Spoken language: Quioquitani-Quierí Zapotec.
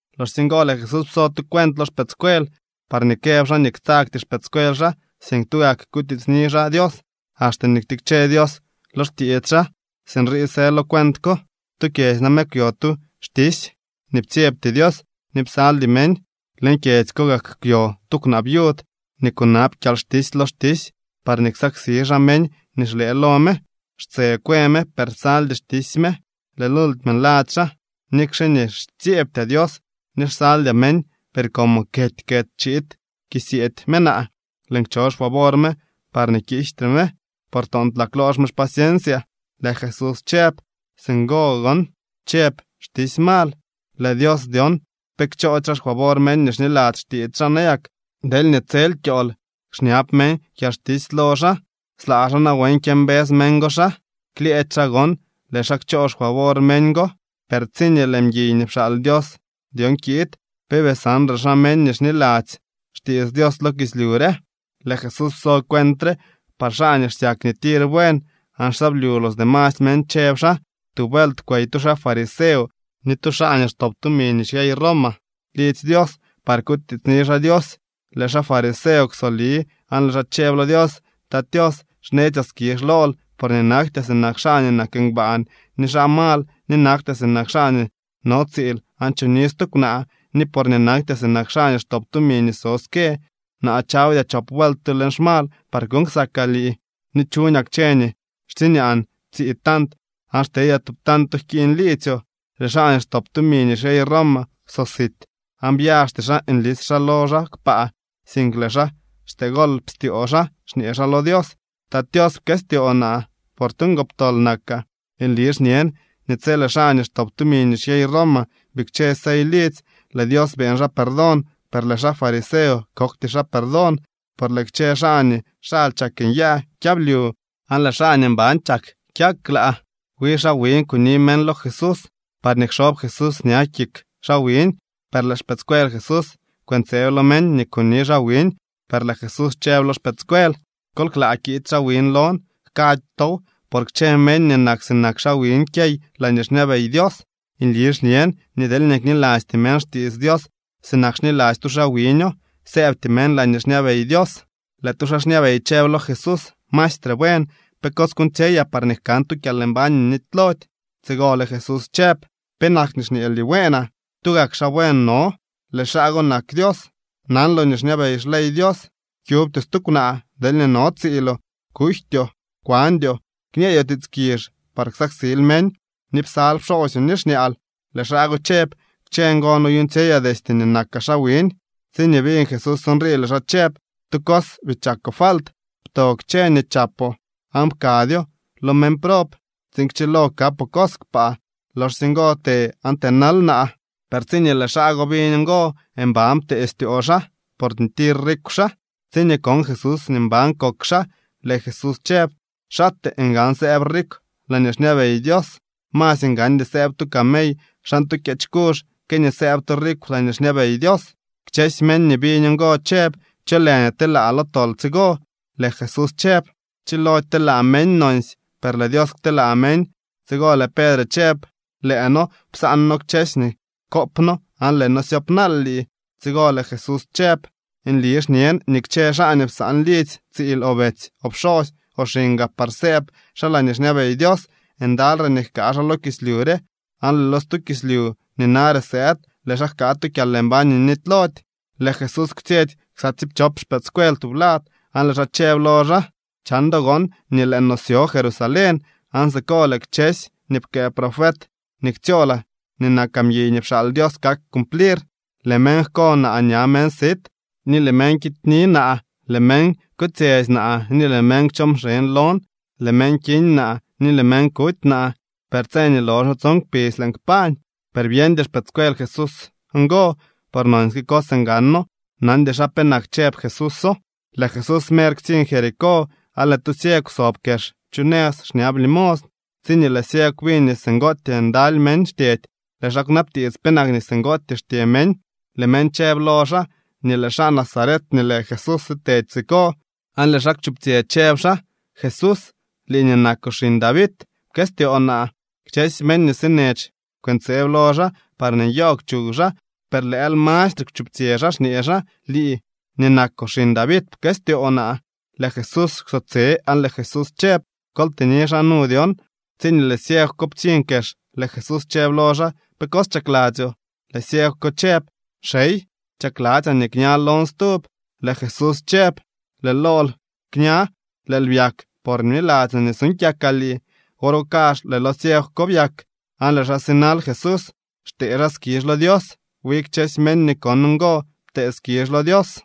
Loxsye ngo lëë Jesús pso tu cuent lo xpëëdscuel parñee këb xaa nii ktsagty xpëëdscuel xaa, sink tugak kutiitsni xaa Dios axte nii ktikche Dios lo xtiits xaa. Sinrii së lo cuent ko: —Tu kyedzy name kwyo tu xtisy nii ptsyebty Dios ni psaldy meñ. Leñ kyedzy ko gak kwyo tu kwnaa viud nii kunab kyalxtisy lo xtisy parñee ksaksi xaa meñ nii xlëë lo me. Xtse kwë me, per psaldy xtisy me. Lëë lultime nladzy xaa: “Nikxe nii xtsyeebtyaa Dios ni xsaldyaa meñ, per como kety kety chiid kisyeedy me naa, lëën kcho xfavor me parñee kiijtre me, por toontlaa kloox me xpaciensyaa.” Lëë Jesús chëb: —Singo gon chëb xtisy mal. ¿Lëë Dios dyon pe kchoody xaa xfavor meñ nii xniladzy xtiits xaa nayak deelñee tsel kyool xñab meñ kyalxtisy lo xaa? ¿Slaa xaa nawen kyëmbës meñ go xaa? Klyëëdy xaa gon, lëë xaa kchoo xfavor meñ go. Per tsiñee lëë mguiy nii pxaal Dios dyon kiid, ¿pe bii sanre xaa meñ nii xniladzy xtiits Dios lo kislyu re? Lëë Jesús pso cuent re par xaa nii xsyak nii tir buen aan xsyablyu los demasy meñ, chëb xaa: —Tu vuelt kwey tu xaa fariseo ni tu xaa nii xtop tumi nii xyey Roma lidzy Dios par kutiitsni xaa Dios. Lëë xaa fariseo kwsoli aan lëë xaa chëb lo Dios: “Tat Tios, xnetsyaa skizh lool, porñee naktyaa sinak xaa nii nak ngbaan, ni xaa mal, ni naktyaa sinak xaa nii no tsiil aan choni stu kwnaa, ni porñee naktyaa sinak xaa nii xtop tumi nii so ske. Naa chawdyaa chop vuelt tu leñ xmal par kuuñ ksakaa lii ni chuñaa kchë nii xtsiñaan tsii tant aan xtedyaa tu tanto jkiiñ liidzyoo.” Lëë xaa nii xtop tumi nii xyey Roma kwsosit aan byaxty xaa nlis xaa lo xaa kpaa, sink lëë xaa xtee golp styoo xaa xñee xaa lo Dios: “¡Tat Tios, pkëstyoo naa, por tu ngoptol nakaa!” Nli xñen nii tsi lëë xaa nii xtop tumi nii xyey Roma bikche sey lidzy, lëë Dios beeñ xaa perdón, per lëë xaa fariseo kokty xaa perdón. Por lëë kchë xaa nii xaly chak nyaa kyablyu aan lëë xaa nii mban chak kyak klaa. Wi xaa wiñ kuni meñ lo Jesús parñee kxob Jesús ña kik xaa wiñ. Per lëë xpëëdscuel Jesús kwëntseeb lo meñ nii kuni xaa wiñ. Per lëë Jesús chëb lo xpëëdscuel: —Kol klaa kiid xaa wiñ lon. Jkady tow, por kchë meñ nii nak sinak xaa wiñ kyey laañee xñabey Dios. Nli xñen nii deelñee knilasty meñ xtiits Dios sinak xniladzy tu xaa wiño, sëëbty meñ laañee xñabey Dios. Lëë tu xaa xñabey chëb lo Jesús: —Maestre buen, ¿pe cos kuuñtsyeyaa parñee jkan tu kyalmbañ nii nitylody? Tsigo lëë Jesús chëb: —¿Penak nii xñeel nii bueenaa? Tugak xaa buen no. Lëë xaa go nak Dios. Nanloo nii xñabey xley Dios: “Kyubtyoo stu kwnaa deelñee no tsiiloo, kujtyoo, kwandyoo, kñeedyoo tiits kizh par ksaksil meñ, ni psal pxoosyoo ni xñaal.” Lëë xaa go chëb: —Kchësy ngo noyuuñtsyeyaa destye nii nakaa xaa wiñ. Tsiñee biñ Jesús nrii, lëë xaa chëb: —Tu cos bii chakoo falt: pto kchësy nii chapoo aan pkadyo lo meñ prob tsiin kchilo kapoo cos kpaa. Loxsye ngo të aan tënal naa. Per tsiñee lëë xaa go biñ ngo, mban ptee styoo xaa, porñee tir rikw xaa. Tsiñee kon Jesús nii mban kok xaa, lëë Jesús chëb: —¡Xaatee ngan sëëb rikw laañee xñabey Dios! Masy ngandy sëëb tu camey xan tu kyeech kuzh que nii sëëb tu rikw laañee xñabey Dios. Kchësy meñ nii biñ ngo chëb: —¿Cho lë nii telaa lo tol tsigo? Lëë Jesús chëb: —Chilody telaa meñ nonsy, per lëë Dios kteelaa meñ. Tsigo lëë Pedre chëb: —Lëë noo psaan kchësy nii koop noo aan lëë noo syoopnaal lii. Tsigo lëë Jesús chëb: —Nli xñen nii kchë xaa nii psaan lidzy, tsiil, o betsy, o pxosy, o xiñ gaa par sëëb xaa laañee xñabey Dios, ndaly re nii jkaa xaa lo kislyu re aan lëë lo stu kislyu nii nare sëëd lëë xaa jkaa tu kyalmbañ nii nitylody. Lëë Jesús kwtsyetsy ksa tsiipchop xpëëdscuel tublad, aan lëë xaa chëb lo xaa: —Chan do gon nii lëë no syo Jerusalén, aan siko lëë kchësy nii pkëë profet nii ktsyoolaa nii nakaa mguiy nii pxaal Dios kak cumplir. Lëë meñ jko naa ña meñ sit, ni lëë meñ kityni naa, lëë meñ kotsyetsy naa, ni lëë meñ kchoo mxeñ lon. Lëë meñ kiñ naa ni lëë meñ kuty naa, per tse nii loxo tson kpidz lëën kpañ. Per byeñdy xpëëdscuel Jesús ngo, por nonsyke cos ngano. Nandy xaa penak chëb Jesúso. Lëë Jesús mer ktsiñ Jericó, aan lëë tu ciegw sob kex chu nëz xñab limosn, tsiñee lëë ciegw biñ nii singootyee ndaly meñ xtyedy, lëë xaa kwnabtiits penak nii singootyee xtye meñ. Lëë meñ chëb lo xaa nii lëë xaa Nazaret nii lë Jesús sitedy siko. Aan lëë xaa kwchuptsyë chëb xaa: —¡Jesús, lii nii nakoo xiñ David, pkëstyoo naa! Kchësy meñ nii sinech kwëntseeb lo xaa parñee nyoogw chuw xaa, per lëël mastre kwchuptsyë xaa xñee xaa: —¡Lii nii nakoo xiñ David, pkëstyoo naa! Lëë Jesús kwsotse, aan lëë Jesús chëb: —Kol tëni xaa nu dyon. Tsiñee lëë ciegw ko ptsiñ kex, lëë Jesús chëb lo xaa: —¿Pe cos chakladzyoo? Lëë ciegw ko chëb: —Xey, chakladzyaa nii kña lon stub. Lëë Jesús chëb: —¡Lëë lool kña! Lëël byak, por bniladzyoo nii suuñ kyakaa lii. Wor go kazh lëë lo ciegw ko byak, aan lëë xaa sinal Jesús xtee xaa skizh lo Dios. Wi kchësy meñ nii kon ngo ptee skizh lo Dios.